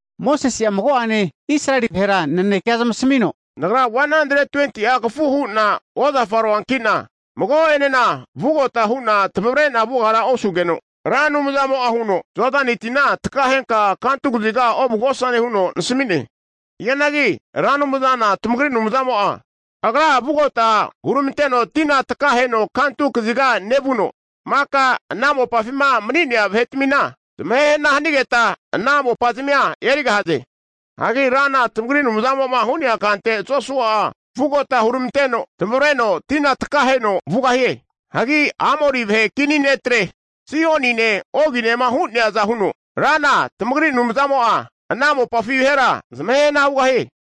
Mosese'a mago'ene Israeli vahera nanekea zamasmino, Nagra 120'a kafu hu'na ozafaroanki'na mago'enena vugota hu'na tamavre'na vugara osugeno, Ra Anumzamo'a huno, Jodani tina takahenka kantu kaziga ovugosane huno nasami'ne. Hianagi Ra Anumzana tamagri Anumzamo'a Agra'a vugota huramanteno tina takaheno kantu kaziga nevuno, maka ana mopafima mani'nea vahe'tamina zamahe hana hanigeta, ana mopazmia erigahaze. Hagi Rana tamagri Anumzamo'ma hu'nea kante Josua'a vugota hurmanteno, tamavreno tina takaheno vugahie. Hagi Amori vahe kini ne'tre Sihonine Oginema hu'neaza huno Rana tamagri Anumzamo'a ana mopafi vahera zamahehna hugahie.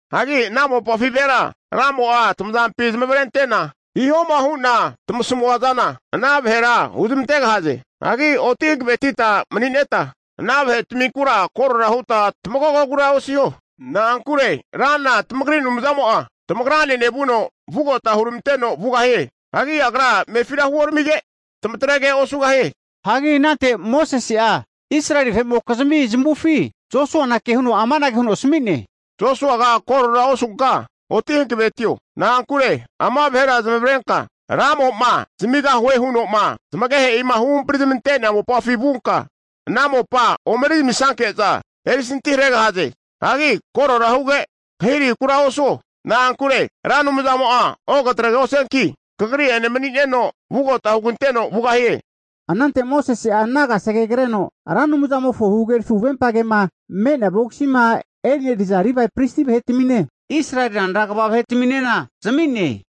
Hagi ana mopafi vahera Ramo'a tamazampi zamavarente'na, hihoma hu'na tamasamua zana ana vahera huzamantegahaze. Hagi oti hankavetita mani'neta ana vahetminkura korora huta tamagogogura osiho. Na'ankure Rana tamagri Anumzamo'a, tamagrane nevuno vugota huramanteno vugahie. Hagi Agra amefira huoramige, tamatrege osugahie. Hagi anante Mosese'a Israeli vahe'mokizimi zamavufi Josuana kehuno amanage huno asami'ne, Josuaga korora osunka oti hankavetio. Na'ankure ama vahera zamavarenka Ramo'ma zamigahue huno'ma zamagehe'ima huhampri zamante'nea mopafi vunka ana mopa omeri zamisanke'za erisantiharegahaze. Hagi korora huge, kahirahikura osuo. Na'ankure Ra Anumzamo'a ogatregosianki, kagri'ene mani'neno vugota huganteno vugahie. Anante Mosese'a ana kasege kreno Ra Anumzamofo huhagerafi huvempa kema me'nea vogisima eneriza Livae pristi vahetamine, Israeli ranra kva vahe'taminena zami'ne.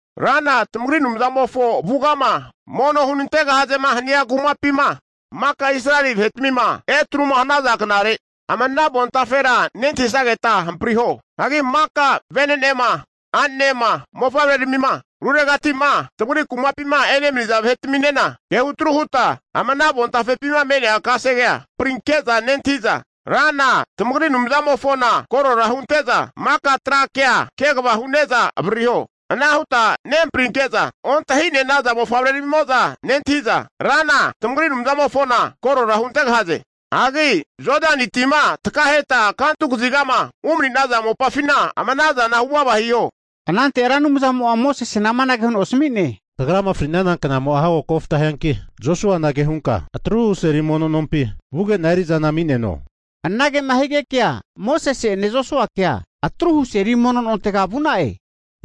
Rana tamagri Anumzamofo avugama mono hunantegahazema hania kumapima maka Israeli vahe'tmima etruma hanaza knare ama ana avontafera nentahisageta hampriho. Hagi maka vene'nema, a'ne'ma mofavreramima, ruregati'ma tamagri kumapima emani'naza vahe'taminena kehutru huta ama avontafepima me'nea kasegea hamprinke'za nentahi'za, Rana tamagri Anumzamofona korora hunente'za maka tra kea kva hune'za avaririho. Ana huta nehamprinke'za ontahi'ne'naza mofavretamimo'za nentahi'za Rana tamagri Anumzamofona korora huntegahaze. Hagi Jodani tima takaheta kantu kazigama umani'naza mopafina, ama ana zana huvava hiho. Anante Ra Anumzamo'a Mosesena amanage huno asmi'ne, Kagrama fri'nana knamo'a hago kofta hianki, Josuana kehunka atruhu seli mono nompi vuge'na eri'zana ami'neno. Anagema higekea Mosese'ene Josuakea atruhu seli mono nontega vu'na'e.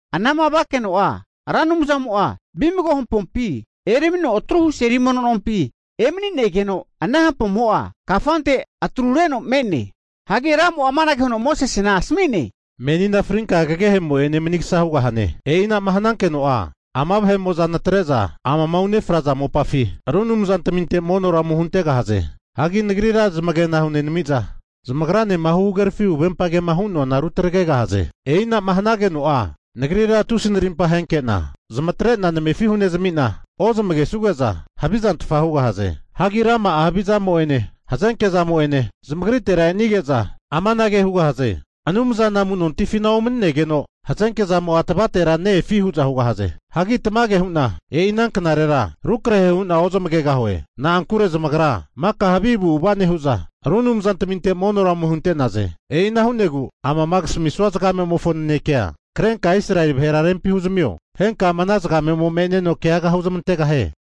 Anama vakeno'a Ra Anumzamo'a vimago hampompi eramino atruhu seli mono nompi emanigeno, ana hampomo'a kafante atrureno me'ne. Hagi Ramo'a amanage huno Mosesena asami'ne, menina frinka kagehe'mo'zane manigasa hugahane. E'i anama hanankeno'a ama vahe'mo'za natre'za amama unefraza mopafi, ru anumzantminte monora ome huntegahaze. Hagi Nagrira zamagena hunenami'za zamagranema huhagerafi huvempa kema hu'noana rutagregahaze. E'i ana'ma hanageno'a, Nagrira tusi narimpa ahenke'na zamatre'na namefi hunezami'na ozamagesuge'za havizantfa hugahaze. Hagi rama'a havi zamo'ene hazenke zamo'ene zamagritera e'nige'za amanage hugahaze, Anumzana amu'nontifina omaninegeno hazenke zamo'a tavatera ne-efi? hu'za hugahaze. Hagi tamage hu'na e'i ana knarera rukrahe hu'na ozamagegahue. Na'ankure zamagra maka havi avu'ava nehu'za ru anumzantaminte monora ome hunte'naze. E'ina hu'negu amama kasamisua zagamemofo nanekea krenka Israeli vahera rempi huzamio. Henka ama ana zagame'mo me'neno keaga huzamantegahie.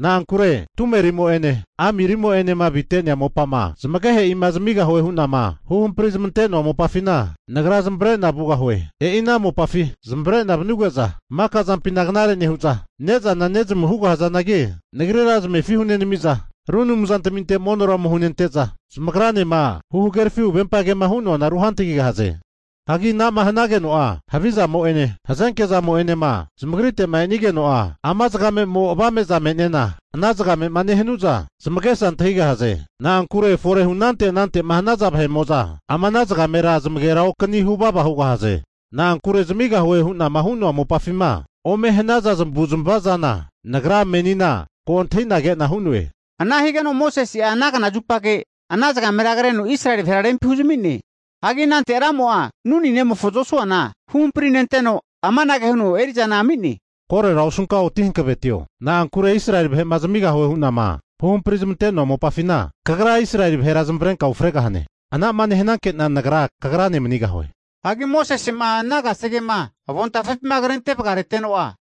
Na'ankure tumerimo'ene amirimo'enema avite'nea mopama zamagehe'ima zamigahue hu'nama huhampri zamante'noa mopafina Nagra zamavare'na vugahue. E'ina mopafi zamavare'na vanuge'za maka zampina knare nehu'za, ne'zana ne'zamu hugahazanagi, Nagrira zamefi hunenami'za ru anumzantami monora ome hunente'za, zamagranema huhagerafi huvempa kema hu'noana ruhantagigahaze. Hagi ana'ma hanageno'a havi zamo'ene, hazenke zamo'enema zamagrite'ma e'nigeno'a, ama zagame'mo avame'za me'nena ana zagamema nehanu'za zamagesa antahigahaze. Na'ankure fore hunante anante'ma hanaza vahe'mo'za ama ana zagamera zamagera okani huvava hugahaze. Na'ankure zamigahue hu'nama hu'noa mopafima ome hanaza zamavu'zamava zana Nagra menina ko antahi'na ke'na hu'noe. Ana higeno Mosese'a ana knazupage ana zagamera kreno Israeli vahera rempi huzami'ne. Hagi anante Ramo'a Nuni nemofo Josuana huhamprinenteno amanage huno eri'zana ami'ne, korera osunka oti hankavetio! Na'ankure Israeli vahe'ma zamigahue hu'nama huhampri zamante'noa mopafina, kagra Israeli vahera zamavarenka ufregahane. Anama nehananke'na Nagra kagrane manigahue. Hagi Mosese'ma ana kasegema avontafepima krente vagareteno'a,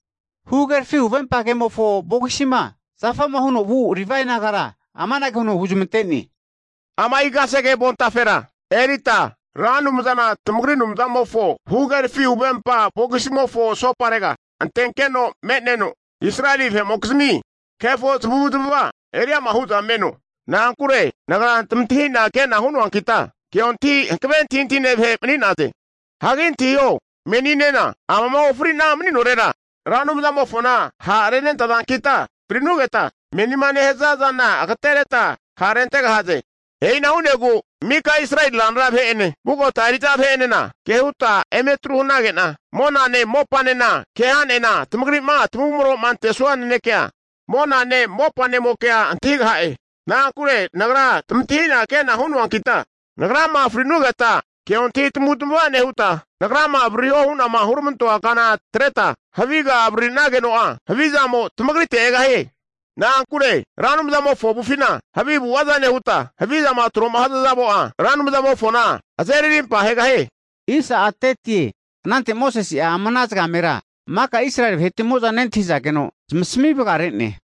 huhagerafi huvempa kemofo vogisima zafama huno vu Livae nagara amanage huno huzmante'ne, Ama'i kasege avontafera erita Ra Anumzana tamagri Anumzamofo huhagerafi huvempa vogisimofo asoparega antenkeno me'neno, Israeli vahe'mokizmi kefo zamavu'zmava eriama hu'za meno. Na'ankure Nagra tamantahina ke'na hunoankita, keontahi hankave antahintahine vahe mani'naze. Hagi antahiho, meninena amama ofri'na mani'norera Ra Anumzamofona ha'renentazankita, fri'nugeta menima nehaza zana agatereta ha'rentegahaze. E'ina hu'negu mika Israeli ranra vahe'ene, vugota eri'za vahe'enena kehuta emetru hanage'na, monane mopanena keha'ne'na tamagri'ma tamavumro'ma antesua nanekea monane mopanemokea antahigaha'e. Na'ankure Nagra tamantahina ke'na hu'noankita, nagrama fri'nugeta keontahi tamavutamava nehuta, nagrama avaririho hu'nama huramantoa kana atreta haviga avariri'nageno'a, havizamo tamagritera egahie. Na'ankure Ra Anumzamofo avufina havi avu'ava nehuta, havizama tro'ma hanaza zamo'a Ra Anumzamofona azeri arimpa ahegahie. Anante Mosese'a ama ana zagamera maka Israeli vahe'tmimo'za nentahizageno zamasami vagare'ne.